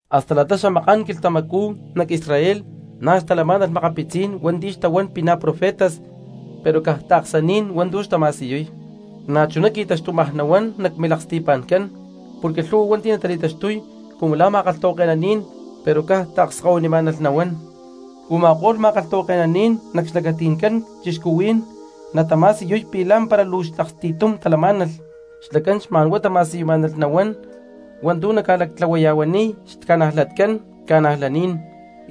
Hasta la̠ta xamaká̠n quilhtamacú nac Israel na̠ xtalamá̠nalh makapitzí̠n hua̠nti̠ xtahuán pi̠ na̠ profetas pero caj taaksaní̠n hua̠ntu̠ xtama̠siyuy. Na̠chuná qui̠taxtumaj nahuán nac milaksti̠pa̠ncán, porque lhu̠hua hua̠nti̠ natali̠taxtuy cumu la̠ ma̠kalhtahuake̠naní̠n pero caj taakskahuinimá̠nalh nahuán. Uma̠kó̠lh ma̠kalhtahuake̠naní̠n nac xlacati̠ncán cristianos natama̠siyuy pi̠ lá̠mpara luu aksti̠tum talamá̠nalh, xlacán xma̠n huá tama̠siyumá̠nalh nahuán hua̠ntu̠ naca̠lactlahuaya̠huaniy xtaca̠najlatcán cristianos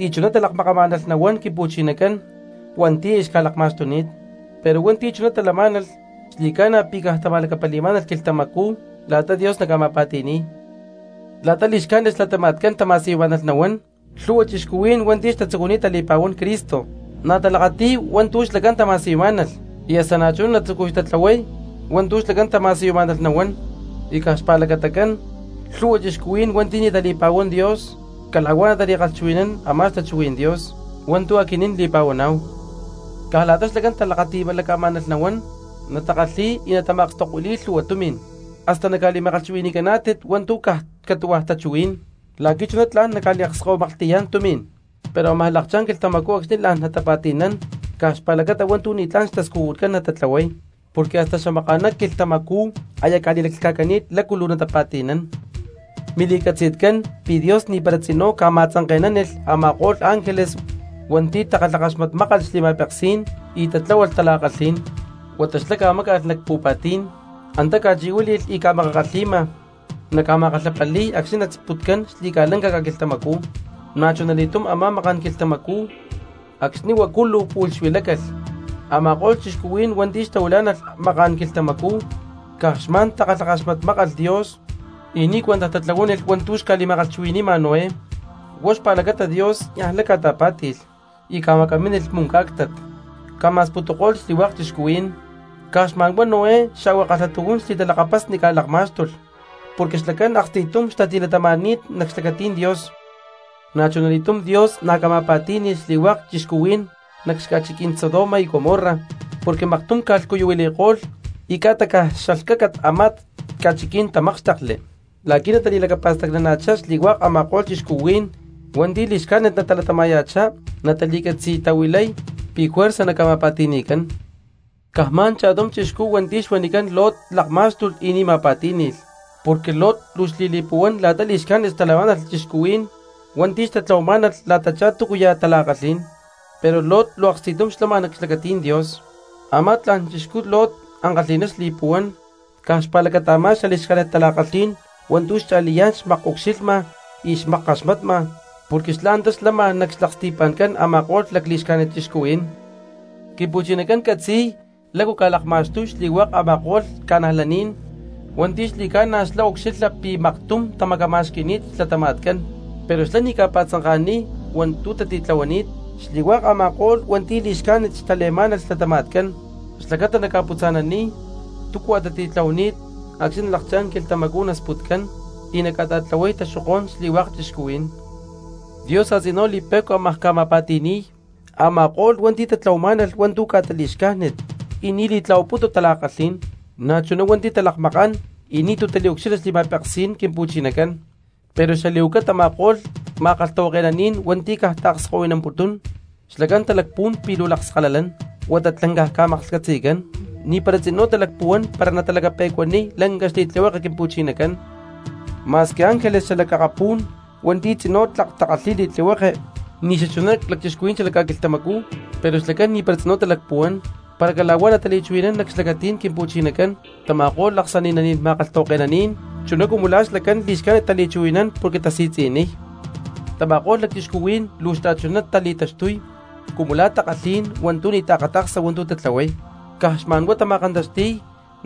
y chuná talakmakamá̠nalh nahuán Quimpu̠chinacán hua̠nti̠ aya xca̠lakma̠xtuni̠t. Pero hua̠nti̠ chuná talamá̠nalh xli̠ca̠na pi̠ caj tama̠lacapali̠má̠nalh quilhtamacú la̠ta Dios naca̠ma̠pa̠ti̠ni̠y. La̠ta li̠xcájnit xlatama̠tcán tama̠siyumá̠nalh nahuán lhu̠hua cristianos hua̠nti̠ aya xtatzucuni̠t tali̠pa̠huán Cristo na̠ natalakati̠y hua̠ntu̠ xlacán tama̠siyumá̠nalh y hasta na̠chuná natzucuy tatlahuay hua̠ntu̠ xlacán tama̠siyumá̠nalh nahuán, y caj xpa̠lacatacán lhu̠hua cristianos hua̠nti̠ ni̠ tali̠pa̠huán Dios cala̠huá natali̠kalhchuhui̠nán a̠má xtachuhuí̠n Dios hua̠ntu̠ aquinín li̠pa̠huaná̠hu. Caj la̠ta xlacán talakati̠laca̠má̠nalh nahuán natakalhi̠y y natama̠akstokuili̠y lhu̠hua tumi̠n, hasta naca̠li̠ma̠kalhchuwi̠ni̠caná̠tit hua̠ntu̠ caj catu̠hua̠ takalhchuhuí̠n la̠qui̠ chuná tla̠n naca̠liakskahuimaklhti̠yá̠n tumi̠n. Pero ámaj lakchá̠n quilhtamacú acxni̠ la̠n natapa̠ti̠nán caj xpa̠lacata hua̠ntu̠ ni̠tlá̠n xtascujutcán natatlahuay, porque hasta xamaka̠ná quilhtamacú aya ca̠li̠lhca̠cani̠t la̠cu luu natapa̠ti̠nán. Mili̠catzi̠tcán pi̠ Dios ni̠para tzinú ca̠ma̠tzanke̠nánilh a̠ma̠ko̠lh ángeles hua̠nti̠ takalhakaxmatmákalh xli̠ma̠peksí̠n y tatláhualh tala̠kalhí̠n, huata xlá ca̠máca̠lh nac pu̠pa̠tí̠n, antá ca̠chi̠huíli̠lh y ca̠makakalhi̠ma, naca̠ma̠kalhapali̠y acxni̠ nasputcán xli̠ca̠lanca ca̠quilhtamacú. Na̠chunali̠túm a̠má maká̠n quilhtamacú acxni̠ huacu luu pu̠lh xuilácalh a̠ma̠ko̠lh cristianos hua̠nti̠ xtahuilá̠nalh maká̠n quilhtamacú, caj xma̠n takalhakaxmatmákalh Dios y ni̠ cuentaj tatlahuánilh hua̠ntu̠ xca̠liakchuhui̠nanima Noé, huá xpa̠lacata Dios niaj lay ca̠ta̠pá̠ti̠lh y macámilh muncá̠ctat, ca̠ma̠sputuko̠lh xli̠hua̠k cristianos, caj xma̠n huá Noé xa̠hua kalhatujún xli̠talakapasni ca̠lakmá̠xtulh porque xlacán aksti̠tum xtatilatama̠ni̠t nac xlacatí̠n Dios. Na̠chunali̠túm Dios na̠ ca̠ma̠pa̠tí̠ni̠lh xli̠hua̠k cristianos nac xaca̠chiquí̠n Sodoma y Gomorra porque maktum ca̠lhcuyuhuili̠ko̠lh y ca̠ta caj xalhcaca a̠má ca̠chiquí̠n tamákxtekli, la̠quí natali̠lacapa̠stacnana̠chá xli̠hua̠k a̠ma̠ko̠lh cristianos hua̠nti̠ li̠xcájnit natalatama̠ya̠chá natali̠catzi̠tahuilay pi̠ juerza naca̠ma̠pa̠ti̠ni̠cán. Caj xma̠n cha̠tum chixcú hua̠nti̠ xuanicán Lot lakmá̠xtulh y ni̠ ma̠pa̠tí̠ni̠lh, porque Lot luu xli̠li̠puhuán la̠ta li̠xcájnit xtalamá̠nalh cristianos hua̠nti̠ xtatlahuamá̠nalh la̠tachá túcuya̠ tala̠kalhí̠n, pero Lot luu aksti̠tum xlama nac xlacatí̠n Dios. Amá tla̠n chixcú Lot ankalhi̠ná xli̠puhuán caj xpa̠lacata a̠má lacli̠xcájnit tala̠kalhí̠n hua̠ntu̠ xcha̠liyá̠n xmakucxilhma y xmakkaxmatma porque xlá antá xlama nac xlaksti̠pa̠ncán a̠ma̠ko̠lh lacli̠xcájnit cristianos. Quimpu̠chinacán catzi̠y lácu ca̠lakma̠xtuy xli̠hua̠k a̠ma̠ko̠lh cristianos hua̠nti̠ xli̠ca̠na xlá ca̠ucxilha pi̠ maktum tamacama̠xqui̠ni̠t xlatama̠tcán, pero xlá na̠ ni̠ ca̠pa̠tzanka̠niy hua̠ntu̠ tatitlahuanít xli̠hua̠k a̠ma̠ko̠lh hua̠nti̠ li̠xcájnit tale̠má̠nalh xlatama̠tcán xlacata naca̠putza̠naniy túcua tatitlahuani̠t acxni̠ nalakchá̠n quilhtamacú nasputcán y naca̠ta̠tlahuay taxokó̠n xli̠hua̠k cristianos. Dios a̠tzinú li̠pe̠cua ámaj ca̠ma̠pa̠ti̠ni̠y a̠ma̠ko̠lh cristianos hua̠nti̠ tatlahuamá̠nalh hua̠ntu̠ ca̠ta li̠xcájnit y ni̠ li̠tlahuaputu tala̠kalhí̠n, na̠chuná hua̠nti̠ talakmakán y ni̠tu̠ taliucxilha xli̠ma̠peksí̠n Quimpu̠chinacán, pero xali̠huaca tama̠ko̠lh ma̠kalhtahuake̠naní̠n hua̠nti̠ caj taakskahuinamputún, xlacán talacpuhuán pi̠ luu lakskalalán, huata tlancaj ca̠maklhcatzi̠cán, ni̠para tzinú talacpuhuán para natalacape̠cuaniy lanca xli̠tlihueke Quimpu̠chinacán. Ma̠squi ángeles xalac akapú̠n hua̠nti̠ tzinú tlak takalhi̠y li̠tlihueke ni̠ xachuná lacchixcuhuí̠n xalac ca̠quilhtamacú, pero xlacán ni̠para tzinú talacpuhuán para cala̠huá natali̠chuhui̠nán nac xlacatí̠n Quimpu̠chinacán tama̠ko̠lh aksani̠naní̠n ma̠kalhtahuake̠naní̠n, chuná cumu la̠ xlacán li̠xcájnit tali̠chuhui̠nán porque tasi̠tzi̠niy. Tama̠ko̠lh cristianos luu xta̠chuná tali̠taxtuy cumu la̠ takalhí̠n hua̠ntu̠ ni̠ taakata̠ksa hua̠ntu̠ tatlahuay, caj xma̠n huá tama̠kantaxti̠y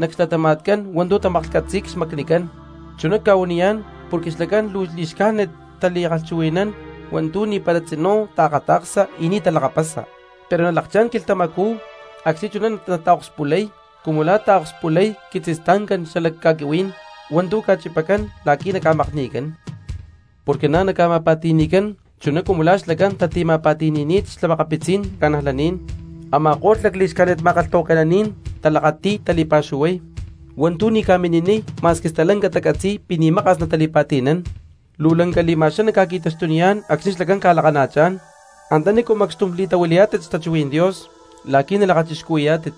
nac xlatama̠tcán hua̠ntu̠ tamaklhcatzi̠y xmacnicán. Chuná cca̠huaniyá̠n porque xlacán luu li̠xcájnit tali̠kalhchuhui̠nán hua̠ntu̠ ni̠para tzinú taakata̠ksa y ni̠ talakapasa. Pero nalakchá̠n quilhtamacú acxni̠ chuná nataakspulay cumu la̠ taakspulay quitzistancá̠n xala ca̠quihuí̠n hua̠ntu̠ ca̠chipacán la̠qui̠ naca̠makni̠cán, porque na̠ naca̠ma̠pa̠ti̠ni̠cán chuná cumu la̠ xlacán tatima̠pa̠ti̠ni̠ni̠t xa̠makapitzí̠n cristianos. Ama̠ko̠lh lacli̠xcájnit ma̠kalhtahuake̠naní̠n talakati̠y tali̠pa̠xuhuay hua̠ntu̠ ni̠ ca̠mini̠niy ma̠squi stalanca tacatzi̠y pi̠ ni̠ maka̠s natali̠pa̠ti̠nán. ¡Luu lanca li̠ma̠xaná ca̠qui̠taxtuniyá̠n acxni̠ xlacán ca̠lakana̠chán antanícu macxtum li̠tahuilayá̠tit xtachuhuí̠n Dios la̠qui̠ nalakachixcuhui̠yá̠tit,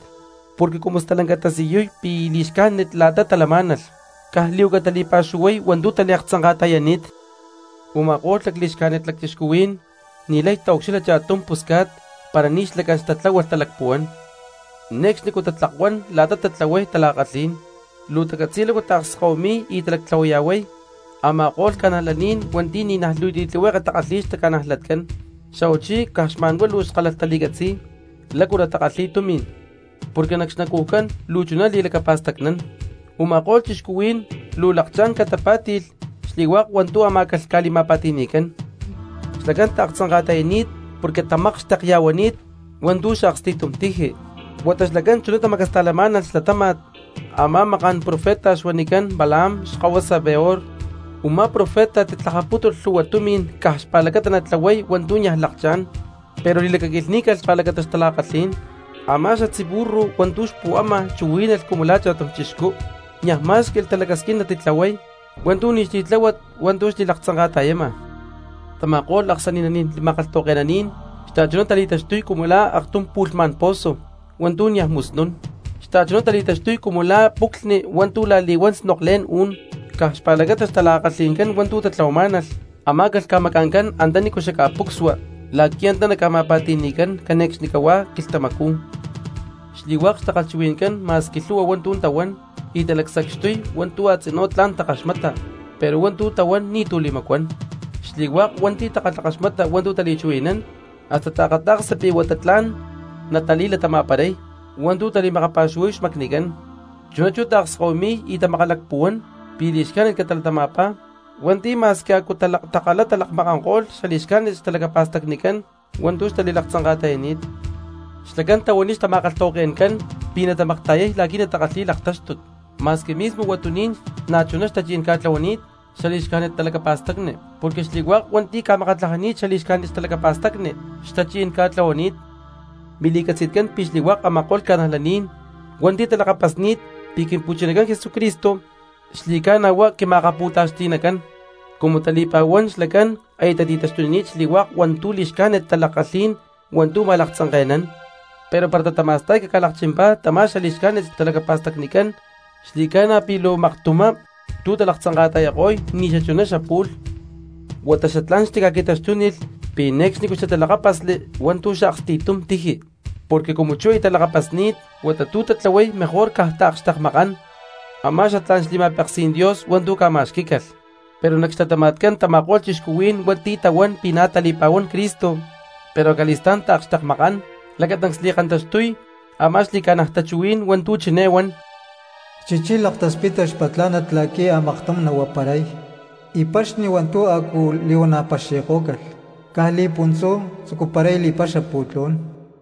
porque cumu stalanca tasiyuy pi̠ li̠xcájnit la̠ta talamá̠nalh, caj li̠huaca tali̠pa̠xuhuay hua̠ntu̠ taliaktzanka̠ta̠yani̠t! Uma̠kó̠lh lacli̠xcájnit lacchixcuhuí̠n ni̠lay taucxilha cha̠tum pusca̠t para ni̠ xlacán xtatláhualh talacpuhuán, ne̠cxnicú tatlakuán la̠ta tatlahuay tala̠kalhí̠n. Luu tacatzi̠y lácu taakskahuimi̠y y talactlahuaya̠huay a̠ma̠ko̠lh cristianos hua̠nti̠ ni̠naj luu tlihueke takalhi̠y xtaca̠najlatcán, xa̠huachí caj xma̠n huá luu skálalh tali̠catzi̠y lácu natakalhi̠y tumi̠n porque nac xnacujcán luu chuná li̠lacapa̠stacnán. Uma̠kó̠lh cristianos luu ca̠lakchá̠n catapá̠ti̠lh xli̠hua̠k hua̠ntu̠ amá̠calh ca̠li̠ma̠pa̠ti̠ni̠cán. Xlacán taaktzanka̠ta̠yani̠t porque tamakxtekya̠huani̠t hua̠ntu̠ xaaksti̠tum tiji, huata xlacán chuná tamacasta̠lamá̠nalh xlatáma̠t a̠má maká̠n profeta xuanicán Balaam xkahuasa Beor, u̠má profeta titlajapútulh lhuhua tumi̠n caj xpa̠lacata natlahuay hua̠ntu̠ niaj lakchá̠n, pero li̠lacaquilhní̠calh xpa̠lacata xtala̠kalhí̠n. Amá xatzí xburro hua̠ntu̠ xpu̠ama chuhuí̠nalh cumu la̠ cha̠tum cristiano, niaj má̠xqui̠lh talacasquín natitlahuay hua̠ntu̠ ni̠ xli̠tláhuat hua̠ntu̠ xliaktzanka̠ta̠yama. Tama̠ko̠lh aksani̠naní̠n ma̠kalhtahuake̠naní̠n xta̠chuná tali̠taxtuy cumu la̠ aktum pu̠lhmá̠n pozo hua̠ntu̠ niaj musnún, xta̠chuná tali̠taxtuy cumu la̠ puclhni hua̠ntu̠ la̠li̠huán snoklé̠n ú̠n; caj xpa̠lacata xtala̠kalhi̠ncán hua̠ntu̠ tatlahuamá̠nalh amá̠calh ca̠maca̠ncán antanícu xaca̠pucsua la̠qui̠ antá naca̠ma̠pa̠ti̠ni̠cán cane̠cxnicahuá quilhtamacú. Xli̠hua̠k xtakalhchuhui̠ncán ma̠squi lhu̠hua hua̠ntu̠ tahuán y talacsacxtuy hua̠ntu̠ a̠tzinú tla̠n takaxmata pero hua̠ntu̠ tahuán ni̠tu̠ li̠macuán, xli̠hua̠k hua̠nti̠ takalhakaxmata hua̠ntu̠ tali̠chuhui̠nán hasta taakata̠ksa pi̠ huata tla̠n natali̠latama̠paray hua̠ntu̠ tali̠makapa̠xuhuay xmacnicán, chuná chú taakskahuimi̠y y tamakalacpuhuán pi̠ li̠xcájnit catalatama̠pá hua̠nti̠ ma̠squi a̠cú takalá lakmakanko̠lh xali̠xcájnit xtalacapa̠stacnicán hua̠ntu̠ xtali̠laktzanka̠ta̠yani̠t. Xlacán tahuaniy xtama̠kalhtahuake̠ncán pi̠ natamakta̠yay la̠qui̠ natakalhi̠y laktáxtut ma̠squi mismo huatuní̠n na̠chuná xtachi̠ncán ca̠tlahuani̠t xali̠xcájnit talacapa̠stacni; porque xli̠hua̠k cristianos hua̠nti̠ ca̠makatlajani̠t xali̠xcájnit xtalacapa̠stacni xtachi̠ncán ca̠tlahuani̠t. Mili̠catzi̠tcán pi̠ xli̠hua̠k a̠ma̠ko̠lh cristianos hua̠nti̠ talakapasni̠t pi̠ Quimpu̠chinacán Jesucristo xli̠ca̠na huá quima̠akapu̠taxti̠nacán, cumu tali̠pa̠huán xlacán aya tati̠taxtunini̠t xli̠hua̠k hua̠ntu̠ li̠xcájnit tala̠kalhí̠n hua̠ntu̠ ma̠laktzanke̠nán; pero para tatama̠sta̠y caca̠lakchimpá tama̠ li̠xcájnit xtalacapa̠stacnicán xli̠ca̠na pi̠ luu maktumá tu̠ talaktzanka̠ta̠yako̠y ni̠ xachuná xapu̠lh. Huata xatlá̠n xtica̠qui̠taxtúnilh pi̠ ne̠cxnicú xtitalakápasli hua̠ntu̠ xaaksti̠tum tiji, porque cumu chú aya talakapasni̠t huata tu̠ tatlahuay mejor caj taakxtekmakán a̠má xatlá̠n xli̠ma̠peksí̠n Dios hua̠ntu̠ ca̠ma̠xquí̠calh. Pero nac xlatama̠tcán tama̠ko̠lh cristianos hua̠nti̠ tahuán pi̠ na̠ tali̠pa̠huán Cristo pero acali̠stá̠n taakxtekmakán lacatancs li̠kantaxtuy a̠má xli̠ca̠naj tachuhuí̠n hua̠ntu̠ chiné huan: “Chichí laktaspitpá xpatlá̠nat la̠qui̠ a̠maktum nahuaparay, y paxni hua̠ntu̠ a̠cu li̠huana̠ paxi̠kó̠calh, caj li̠puntzú tzucuparay li̠paxa pu̠tlú̠n.”